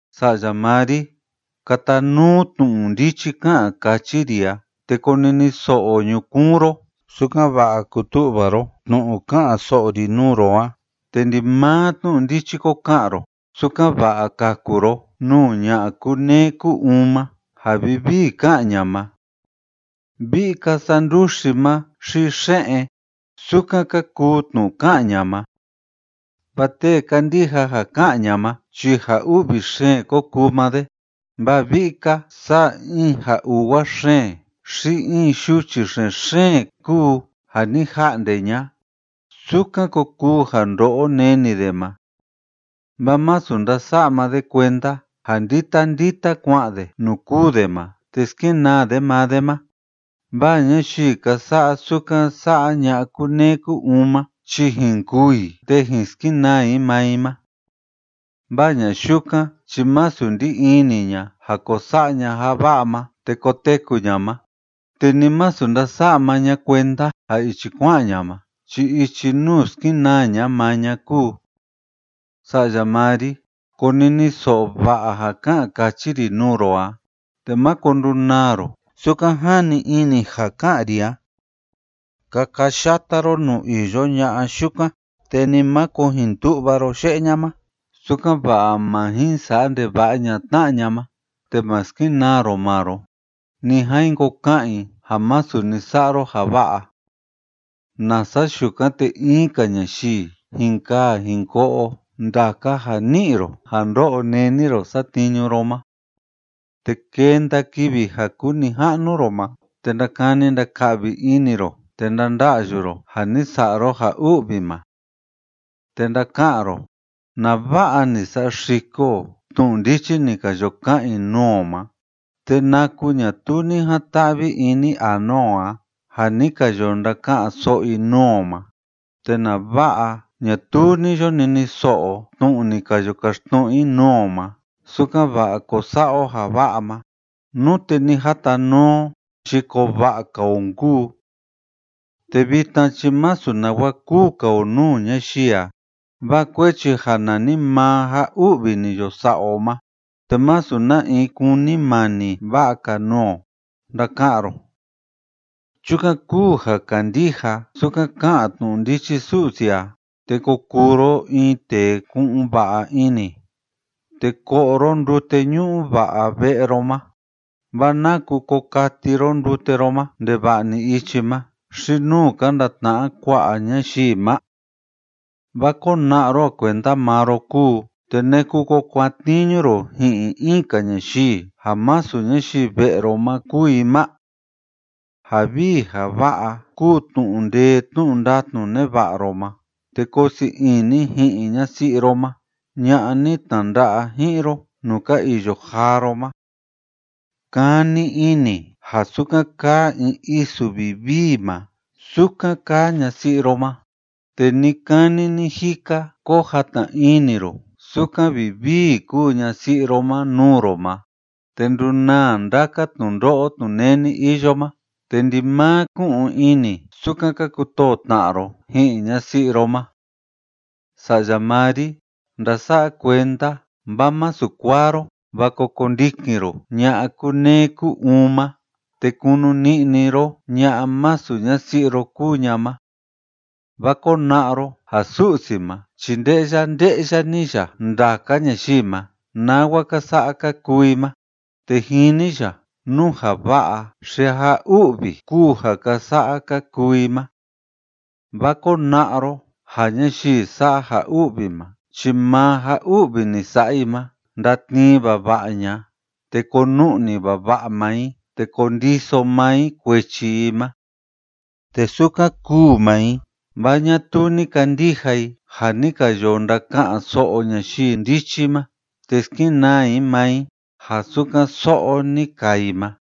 Sa'ya maa ri, katanuu tnu'u ndichi ká'an káchi ri a, te koniniso'o ñukuun ro, sukan‑va'a kutu'va ro tnu'u ká'an so'o ri nuu ro a te ndimaa tnu'u ndichi ko ka'an ro, sukan‑va'a kaku ro nuu ña'a kúneé kú‑uun ma ja vivii ká'an ña ma. Vi'i‑ka saa nduxi ma xi xe'en, sukan ka kuu tnu'u ká'an ña ma. Vaa tee kandija ja ká'an ña ma chi ja u'vi xeen ko kuu maa de, vaa vi'i‑ka saa in ja uwa xeen xi in yuchi xen‑xeen kúu ja ni ja'nde ña'a, sukan ko kuu ja ndo'o neni de ma. Vaa masu ndása'a maa de kuenda ja ndita ndita kua'an de nuu kûu de ma te skenaa de maa de ma, vaa ñayii ka sa'a sukan sa'a ña'a kúneé kú‑uun ma chi jin kûu i te jin skenaa i maa i ma. Vaa ña'a yukan chi masu ndí ini ña ja ko sa'a ña ja va'a ma te koteku ña ma, te ni masu ndása'a maa ña kuenda ja ichi kua'an ña ma chi ichi nuu skenaa ña maa ña kúu. Sa'ya maa ri, koniniso'o va'a ja ká'an káchi ri nuu ro a, te máko ndunaa ro sukan jani ini ja ká'an ri a. Kakayata ro nuu iyo ña'a yukan, te ni máko jin tu'va ro ye'e ña ma, sukan‑va'a má jin sa'a ndeva'a ña'a tna'a ña ma te ma skenaa ro maa ro, ni a jin ko ka'an i ja masu ni sa'a ro ja va'a, nasa yukan te in‑ka ñayii jin kaa jin ko'o ndaka ja ni ni'i ro ja ndo'o neni ro satniñu ro ma, te kenda kivi ja kuu nija'nu ro ma te ndakani ndaka'vi ini ro te ndanda'yu ro ja ni sa'a ro ja u'vi ma. Te ndaka'an ro: “Nava'a ni saxiko o tnu'u ndichi ni ka yo ka'an i nuu o ma, te naku ñatuu ni jan‑ta'vi ini anua o a ja ni ka yo ndaka'an so'o i nuu o ma, te nava'a ñatuu ni yo niniso'o o tnu'u ni ka yo kaxtnu'u i nuu o ma sukan‑va'a ko sa'a o ja va'a ma. Nute ni jatanuu o chi koo va'a‑ka o nkuu. Te vitna chi masu nawa kúu‑ka o nuu ñayii a, vaa kuechi ja nanimaa ja u'vi ni yo sa'a o ma, te masu na in kúnimani va'a‑ka nuu o”, ndaka'an ro. Chukan kúu ja kandija sukan ká'an tnu'u ndichi Su'si a, te ko kuu ro in tee ku'un va'a ini, te ko'o ro ndute ñu'u va'a ve'e ro ma. ¿Vaa naku ko kati ro ndute ro ma ndeva'a‑ni ichi ma xi nuu ka ndatna'a kua'a ñayii ma? Vaa kona'a ro ja kuenda maa ro kúu, te ¿naku ko kuatniñu ro ji'in in‑ka ñayii ja masu ñayii ve'e ro ma kúu i ma? Ja vii ja va'a kúu tnu'u ndee tnu'u ndatnu neva'a ro ma, te koo sii ini ji'in ñasi'i ro ma ña'a ni tnanda'a ji'in ro nuu ka iyo jaa ro ma. Kani ini ja sukan kaa in isu vivii ma, sukan kaa ñasi'i ro ma, te ni‑kani ni‑jika ko jatna ini ro sukan vivii kúu ñasi'i ro ma nuu ro ma. Te ndunaa ndaka tnundo'o tnuneni iyo ma, te ndimaa ku'un ini sukan ka kutoo tna'a ro ji'in ñasi'i ro ma. Sa'ya maa ri, ndasa'a kuenda vaa masu kuaa ro, vaa ko kondikin ro ña'a kúneé kú‑uun ma te kunu ni'ni ro ña'a masu ñasi'i ro kúu ña ma. Vaa kona'a ro ja Su'si ma chi nde'ya nde'ya‑ni ya ndaka ñayii ma nawa ka sa'a ka kuu i ma, te jini ya nú ja va'a xi ja u'vi kúu ja ka sa'a ka kuu i ma. Vaa kona'a ro ja ñayii sa'a ja u'vi ma chi maa ja u'vi ni sa'a i ma ndatnii vava'a ña'a te konu'ni vava'a maa i, te kondiso maa i kuechi i ma. Te sukan kûu maa i, vaa ñatuu ni kandija i ja ni ka yo ndaka'an so'o ñayii ndichi ma, te skenaa i maa i ja sukan so'o ni kaa i ma.